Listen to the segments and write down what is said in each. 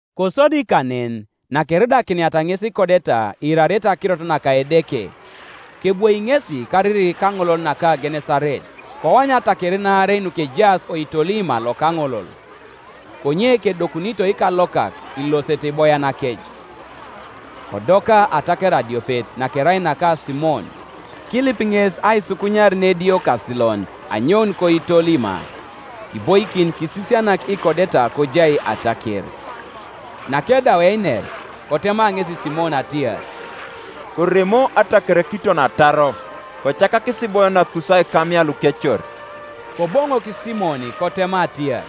Kosodi kanen nakeridakiniata ŋes ikodeta iirarete akirot naka Edeke, kebwoi ŋesi kariri kaŋolol naka Genesaret. Koany atakerin aarei nukejaas oitolima loka aŋolol; konye kedokunito ikalokak ilosete iboyanakec. Kodoka ataker adiopet, nakerai naka Simon, kilip ŋes aisukunyar nediokasilon anyoun koitolima, Kiboikin kisisianak ikodeta kojai ataker. Nakedau einer, kotema ŋesi Simon atiar, “Koremo ataker kiton ataro, kocakakis iboyanakus aikamia lukecor.” Koboŋok Simon kotema atiar,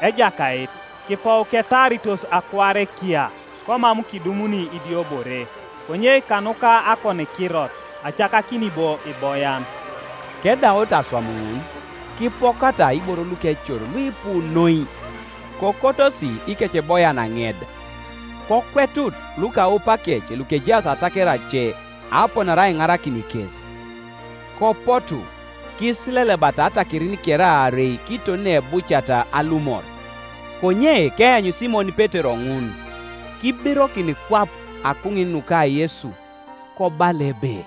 “Ejakait, kipou ketaaritos akuare kiya, komam kidumuni idiobore: konye kanuka akonikirot, acakakini bo iboyan.” Kedaut aswam ŋun, kipokata iboro lukecor luipu noi: kokotosi ikeceboyan aŋed; kokwetut lukaupakec lukejaas ataker ace aponare aiŋarakin kes. Kopotu, kisilelebata atakerin kere aarei kiton neebuciata alumor. Konye keanyu Simon Petero ŋun, kibirokin kwap akuŋin nuka Yesu, kobala ebe,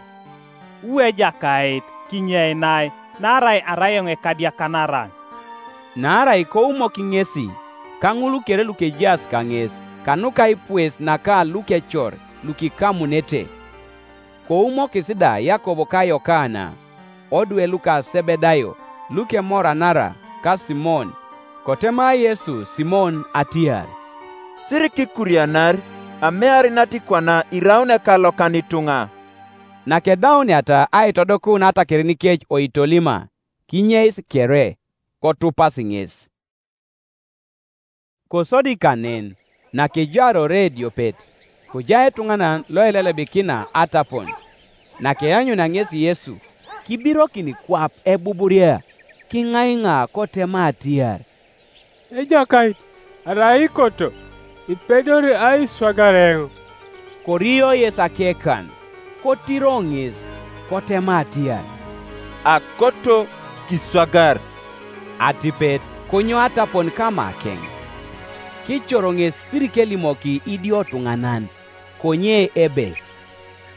“Wu Ejakait, kinyeinai, naarai arai eoŋ ekadiakanaran.” Naarai koumok ŋesi, ka ŋul kere lukejaas kaŋes, kanuka aipues naka lukecor lukikamunete: koumokis da Yakob ka Yokana, odwe luka Sebedayo, lukemoranara ka Simon. Kotema Yesu Simon atiar, “Sirikikurianar; amear natikwana iraun ekalokan ituŋa.” Nakedauniata aitodokun atakerinikec oitolima, kinyeis kere, kotupasi ŋes. Kosodi kanen, nakejaar ore ediopet, kojai etuŋanan loelelebikina atapon: nakeanyunia ŋesi Yesu, kibirokin kwap ebuburia, kiŋaiŋa kotema atiar, “Ejakait, arai ikoto, ipedori aiswagar eoŋ.” Korio Yesu akekan, kotiro ŋes, kotema atiar, “Akoto; kiswagar.” Atipet konyou atapon kamakeŋ. Kicor ŋes sirikelimoki idiotuŋanan; konye ebe,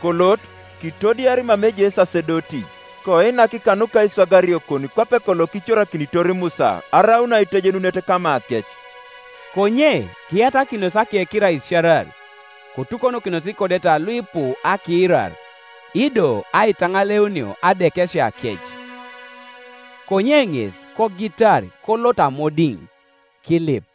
“Kolot, kitodiar mama ejai esasedoti, koinak kanuka aiswagariokon kwape kolo kicorakinitor Musa, araun aitejenunet kamakec.” Konye kiyatakinos akekiro aisiarar: kotukonokinos ikodeta luipu akiirar, ido aitaŋaleunio adekesiakec. Konye ŋes kogitar kolot amodiŋ, kilip.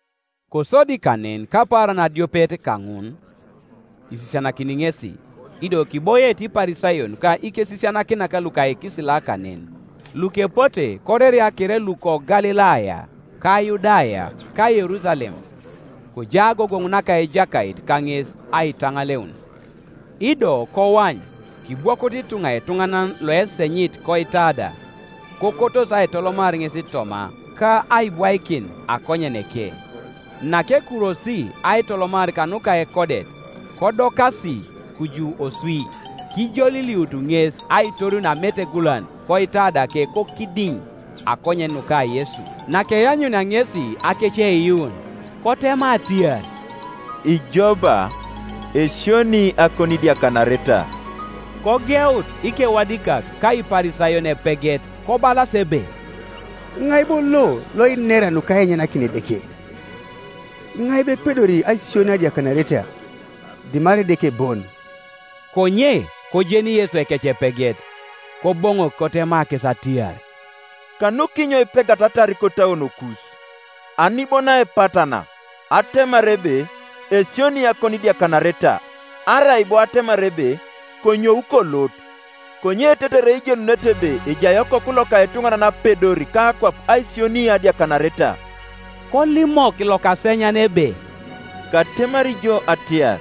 Kosodi kanen kapaaran adiopet kaŋun, isisianakini ŋesi: ido kiboiete Iparisayon ka ikesisianakinak luka ikisila kanen, lukepote koreria kere luko Galilaya ka Yudaya ka Yerusalem: kojai agogoŋ naka Ejakait kaŋes aitaŋaleun. Ido koany, kibwokut ituŋa etuŋanan loesenyit koitada: kokotos aitolomar ŋes toma, ka aibwaikin akonyeneke, Nakekurwosi aitolomar kanuka ekodet, kodokasi kuju oswi, kijoliliut ŋes aitorunio ametegulan koitadake kokidiŋ, akonyen nuka Yesu, Nakeanyunia ŋesi akeceiyuun kotema atiar, “Ijo ba, esionii akonidiakanareta.” Kogeut ikewadikak ka Iparisayon epeget kobalas ebe, “Tŋai bo lo loinera nukainyanakin Edeke? Iŋai bo epedori aisioni adiakanareta, dimarai Edeke bon?” Konye kojeni Yesu ekecepeget, koboŋok kotema kes atiar, “Kanukinyo ipegatatar kotauonokus? Ani bo naepatana, atemar ebe, ‘Esionii akonidiakanareta,’ arai bo atemar ebe, ‘Konyou kolot?’ Konye tetere ijenunete ebe ejai Okoku loka etuŋanan apedor kakwap aisioni adiakanareta,” (kolimok lokasenyan ebe,) “Katemari jo atiar,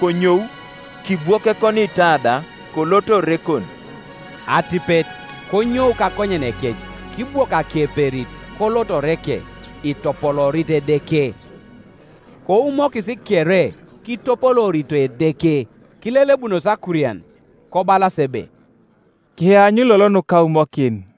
Konyou, kibwok ekoniitada, kolot orekon.” Atipet konyou kakonyenekec, kibwok akeperit, kolot oreke, itopoloorit Edeke. Koumokis kere, kitopoloorito Edeke; kilelebunos akurian, kobalas ebe, “Kiany lolo nukaumokin.”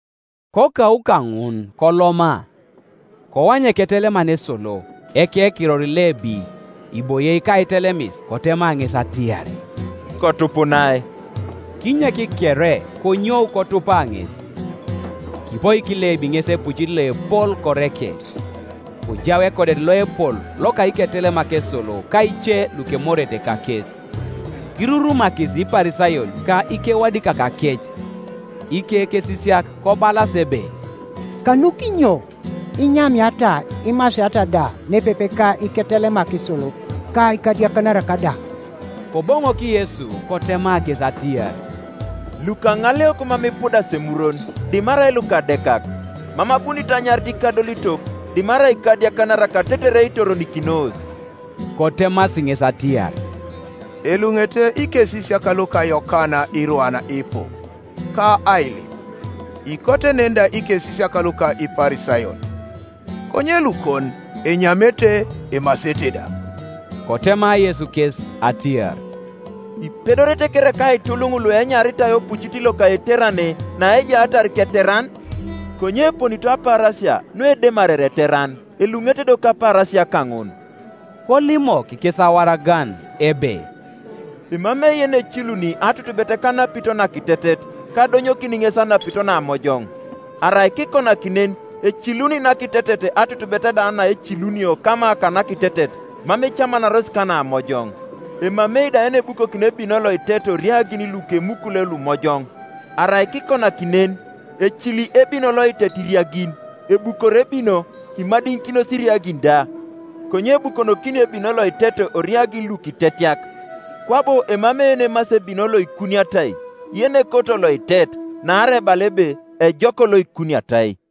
Kokau kaŋun koloma, koany eketeleman esolo, ekekiror Lebi, iboie kaitelemis, kotema ŋes atiar, “Kotupunai.” Kinyek kere, konyoi: kotupa ŋes. Kipoik Lebi ŋes epucit loepol koreke: kojau ekodet loepol loka iketelemak esolo ka ke lukemorete kakes. Kirurumakis Iparisayon ka ikewadikakakec ikekesisiak kobalas ebe, “Kanukinyo inyamiata imasiata da nepepe ka iketelemak esolo ka ikadiakanarak da?” Koboŋok Yesu kotema kes atiar, “Lukaŋaleok mam ipudas emurwon; dimarai lukadekak. Mam abunit anyarit ikadolitok, dimarai ikadiakanarak tetere itoronikinos.” Kotemasi ŋes atiar, “Eluŋete ikesisiak luka Yokana irwan ipu, ka ailip; ikote nen da ikesisiak luka Iparisayon; konye lukon enyamete emasete da.” Kotema Yesu kes atiar, “Ipedorete kereka aituluŋ luenyaritai opucit loka eiterane, naejaatar keteran? Konye eponito apaarasia, nuedemarere eteran, eluŋete do kapaarasia kaŋun.” Kolimok kes awaragan, ebe, “Emamei yeneciluni atutubet kanapito nakitetet, ka adonyokin ŋes anapito namojoŋ; arai kikonaki nen eciluni nakitetet, atutubet da naecilunio kama kanakitetet, mam ecamanaros kanamoion. Emamei da yenebukokini ebino loitet oriagin lukemukule lumojoŋ; arai kikonaki nen, ecili ebino loitet iriagin, ebukor ebino, imadiŋikinos iriagin da. Konye ebukonokinio ebino loitet oriagin lukitetiak. Kwabo emamei yenemasi ebino loikuniatai, yenekoto loitet; naarai ebala ebe, ‘Ejok loikuniatai.’”